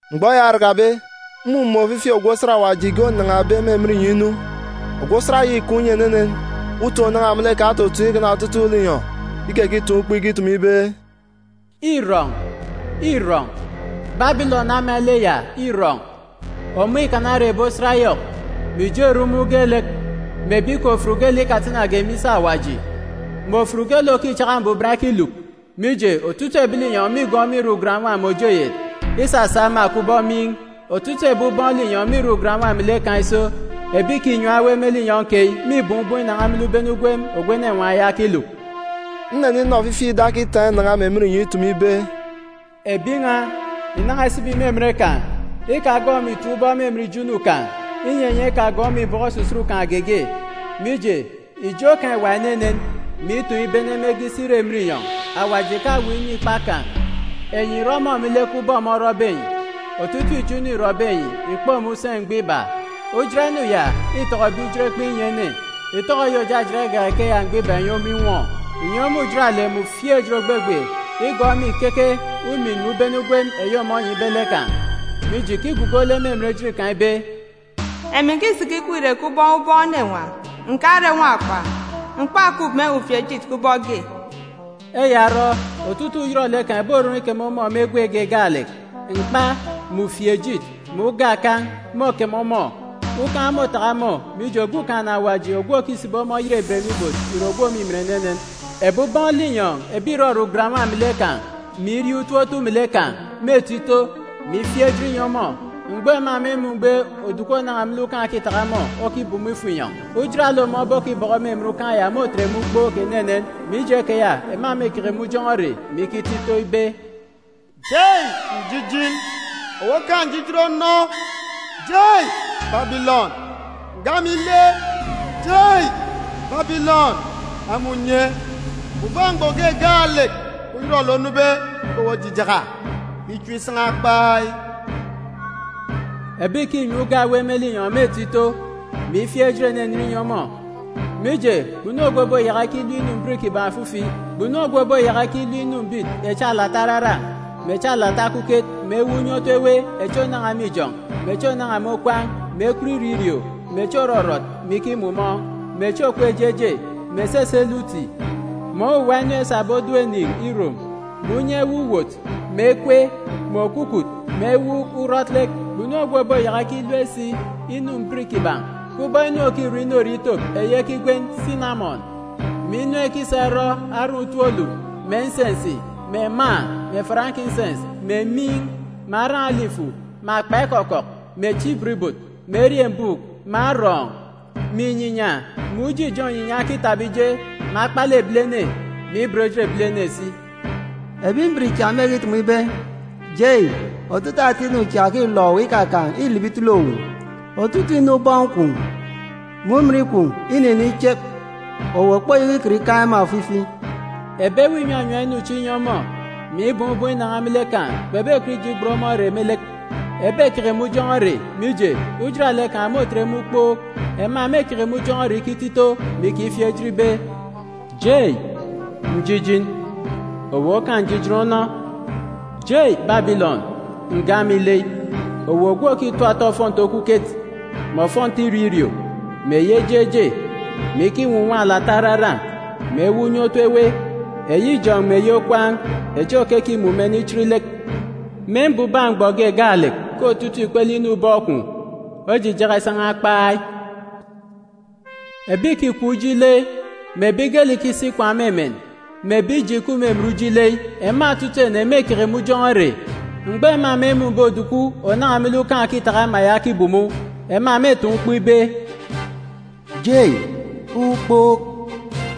Mgbọ eya orakabe, mmumun̄ ofifi ogwu osat Awaji ge onan̄abe me emen inyọn̄ inu. Ogwu osat ya îkaan̄ unye enenen, utoon̄ òrirọ ònan̄a me lek kan̄ ototoon̄ ikana otutuuk linyọn̄. Ikekitaan̄ ukpo ikitumu ibe, “Îrọn̄! Îrọn̄! Babilọn ama ile ya îrọn̄! Ọmọ îkana ere ebi osat yọk, mè ijo erumun̄ geelek, mè ebi kè ofut geelek ikatanage me isi Awaji, mè ofut geelek òkichaka mbuban ekiluk. Mije, otutuuk ebi linyọn̄ mîgọọk ọmọ irọ ugan-nwa mè òje oyet, isasa ema kubọk miin̄. Otutuuk ebi ubọọn̄ linyọn̄ mîrọ ugan-nwa melek kan̄ iso. Ebi ìkinyam ewe me linyọn̄ keyi mîbọọn̄ ubọọn̄ inan̄a me lek ubene ugwem ogwu enenwaan̄ ya okiluk.” Nneninọ ofifi ida okitaan̄ inan̄a me emen inyọn̄ itumu ibe, “Ebi n̄a, ìnan̄a ìsibi me emen kan̄! Ikagọọk ọmọ ìtap ubọk me emen ijo inu kan̄, inyi enyi ekagọọk ọmọ ìbọkọ osusut kan̄ geege. Mije ijo kan̄ îwa enenen, mè itoon̄ ibene mege isi ire emen inyọn̄. Awaji ìkawuuk inu ikpak kan̄! Enyi ìrọ ọmọ me lek ubọk ọmọ orọbe enyi. Otutuuk ijo inu îrọbe enyi, ìkpe ọmọ useen̄ mgbọ iba. Ujat inu ya îtọkọbe ijot ekpen̄ inyi ene, ìtọkọ eyi òjajat igak ikeya mgbọ iba ìnyi ọmọ inwọ. Ìnyi ọmọ ujaralek mè ufieejit ògbegbe ìgọọk me ìkeke umin mè ubene ugwem eyi ọmọ onyibe lek kan̄. Mije, ìkigugo lek me emen ejit kan̄ ibe, ‘Emi ǹkisiki ikweek irek kubọk ubọọn̄ enenwaan̄, ǹkare nwakpa, m̀kpakup me ufieejit kubọk ge.’ Eya orọ, otutuuk uyọrọlek kan̄ ìborọn̄ ikeme ọmọ me egwe ge gaalek. Mkpa, mè ufieejit, mè uga akan̄, môkeme ọmọ. Ukan̄ môtaka ọmọ, mije, Okumugwem Awaji ogwu òkisibi ọmọ oyerebet me ibot ìre ogwu òmimin enenen. “Ebi ubọọn̄ linyọn̄ ebi ìrọrọ ugan-nwa melek kan̄, mè irie utop otu melek kan̄, mêto ito, mè ifieek ejit inyi ọmọ mgbọ ema mêmun̄be oduku ònan̄a me lek ukan̄ òkitaka ọmọ okibumu ifo inyọn̄. Ujaralek ọmọ obokibọkọ me emen ukan̄ ya môtet ema ukpook enenen. Mije keya, ema mêkeke me ujọn̄ọ ere, mè ikito ito ibe, “ ‘Jei, njijin! Owu okaan̄ njijin onọ! Jei, Babilọn, nga ama ile! Jei, Babilọn, ama unye! Mbubak mgbọ ge gaalek uyọrọlek onube ke owu ojijaka, mè ichep isan̄a kpai!’ “Ebi ìkinyam uga ewe me linyọn̄ mêto ito, mè ifieek ejit enenen inyi ọmọ, mije, kpunu ogwu òboyaka ikilep ogbogbo inu mbit kiban̄ ofifi. Kpunu ogwu òboyaka ikilep inu mbit echi alata araran̄, mè echi alata okuket, mè ewuuk unye otu ewe, echi ònan̄a me ijọn̄, mè echi ònan̄a me okwaan̄, mè ekwut irio irio, mè echi òrọrọt mè ikimumọọn̄, mè echi òkup eje eje, mè esese lek uti, mè owuwa inu esabe oduuk eniin̄ irom, mè unye ewe uwot, mè ekwe, mè okwukwut, mè ewuuk urọt lek. Kpunu ogwu òboyaka ikilep si inu mbit kiban̄, kubọk inu òkirọ inorie itop eyi ekigwen sinamọn, mè inu ekisa irọ aran̄ utop olu, mè nsensi, mè mâa, mè farankinsens, mè miin̄, mè aran̄ olifu, mè akpa ekọkọk, mè echi ibot ibot, mè eriembuuk, mè arọọn̄, mè inyinya, mè uji akọn̄ inyinya okitaba ije, mè akpalek ebilene, mè ibot ejit ebilene si. “Ebi mbit cha mêkitumu ibe, ‘Jei, otutuuk ata inu cha òkilọk owu ikakaan̄ îlibi itele owu. Otutuuk inu ubọọn̄ kwun̄, mè òrirọ kwun̄ îniniin̄ ichep, owu òkpoyaka ikọt ikaan̄ ema ofifi.’ Ebi ewe ìnyanyam inu chi inyi ọmọ, mè ibọọn̄ ubọọn̄ inan̄a me lek kan̄ kpebekọt ije igbet ọmọ ere me lek. Ebekeke me ujọn̄ọ ere, mije, ujaralek kan̄ môtet ema ukpook. Ema mêkeke me ujọn̄ọ ere ikito ito, mè ikifieek ejit ibe, “ ‘Jei, njijin! Owu okaan̄ njijin onọ! Jei Babilọn, nga ama ile! Owu ogwu òkitap ata ofọnti okuket, mè ofọnti irio irio, mè eyi eje eje, mè ikinwunwan̄ alata araran̄, mè ewuuk unye otu ewe eyi ijọn̄ mè eyi okwaan̄, echi òkekimumen, ichit lek. Me mbubak mgbọ ge gaalek ke otutuuk ikpele inu ubọọn̄ kwun̄ ojijaka isan̄a kpai.’ “Ebi ìkikọp uji ile, mè ebi geelek ìkisi ikwaan̄ me emen, mè ebi ije ìkup me emen uji ile, ema otutuuk ene mêkeke me ujọn̄ọ ere. Mgbọ ema mêmun̄be oduku ònan̄a me lek ukan̄ òkitaka ama ya okibumu, ema mêtaan̄ ukpo ibe, ‘Jei, ukpook!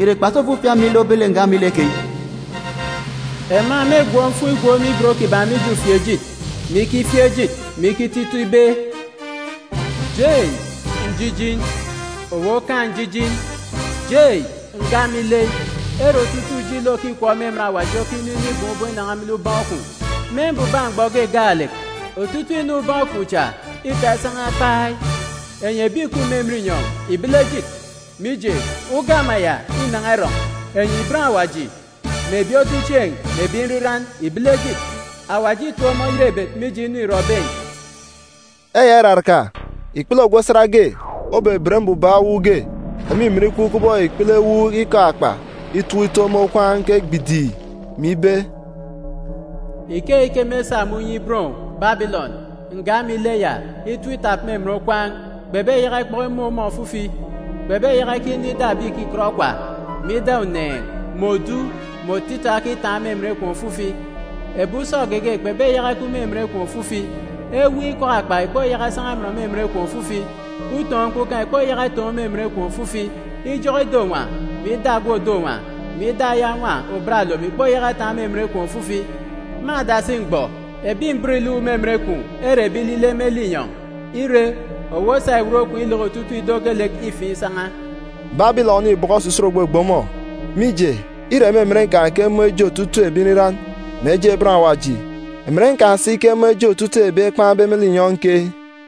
Ìre kpasi ofifi ama ile obet lek nga ama ile keyi?’ Ema mêgwọ mfuun̄ igwook me ibot kiban̄ mije ufieejit, mè ikifieek ejit, mè ikito ito ibe, “ ‘Jei, njijin! Owu okaan̄ njijin! Jei, nga ama ile, ere otutuuk uji ile òkikọp me emen awaji okinu inibọọn̄ ubọọn̄ inan̄a me lek ubọọn̄ kwun̄. Me mbubak mgbọ ge gaalek, otutuuk inu ubọọn̄ kwun̄ cha îta isan̄a kpai! Enyi ebi ìkup me emen inyọn̄, ìbele ejit, mije, uga ama ya înan̄a irọn̄! Enyi bọn Awaji, mè ebi otuchieen̄, mè ebi nriran, ìbele ejit! Awaji îtip ọmọ oyerebet mije inu îrọbe enyi.’” Eya iraraka, ikpele ogwu osat ge obeben mbubak ewuuk ge òmimin ikup kubọk ikpele ewuuk ikọk-akpa itọp ito me okwaan̄ ke gbidìi, mè ibe, “Ikeyi ke mêsa me unye iben owu, Babilọn, nga ama ile ya, itọp itap me emen okwaan̄, kpebeyaka ikpọk imun̄ ọmọ ofifi. Kpebeyaka ikinọ ida ebi ìkikọt okwa, mè ida uneen̄, mè òja, mè otita okitaan̄ me emen kwun̄ ofifi. Ebi usọ geege kpebeyaka ikup me emen kwun̄ ofifi. Ewuuk ikọk-akpa ìkpoyaka isan̄a amọn me emen kwun̄ ofifi. Utoon̄ mkpukan̄ ìkpoyaka itoon̄ me emen kwun̄ ofifi. Ijọk ido-nwa, mè ida ogwu òdo nwa, mè ida aya nwa òbat olom ìkpoyaka itaan̄ me emen kwun̄ ofifi. Me adasi mgbọ, ebi mbit ìluk me emen kwun̄ ere ebi ilile me linyọn̄. Ire, owu osa iwot kwun̄ ileke otutuuk ido geelek ifiin̄ isan̄a.” Babilọn îbọkọ osusut ògbegbe ọmọ, mije, îre me emen kan̄ ke emun̄ eje otutuuk ebi nriran, mè eje bọn Awaji, emen kan̄ si ke emun̄ eje otutuuk ebi ekpan̄be me linyọn̄ keyi.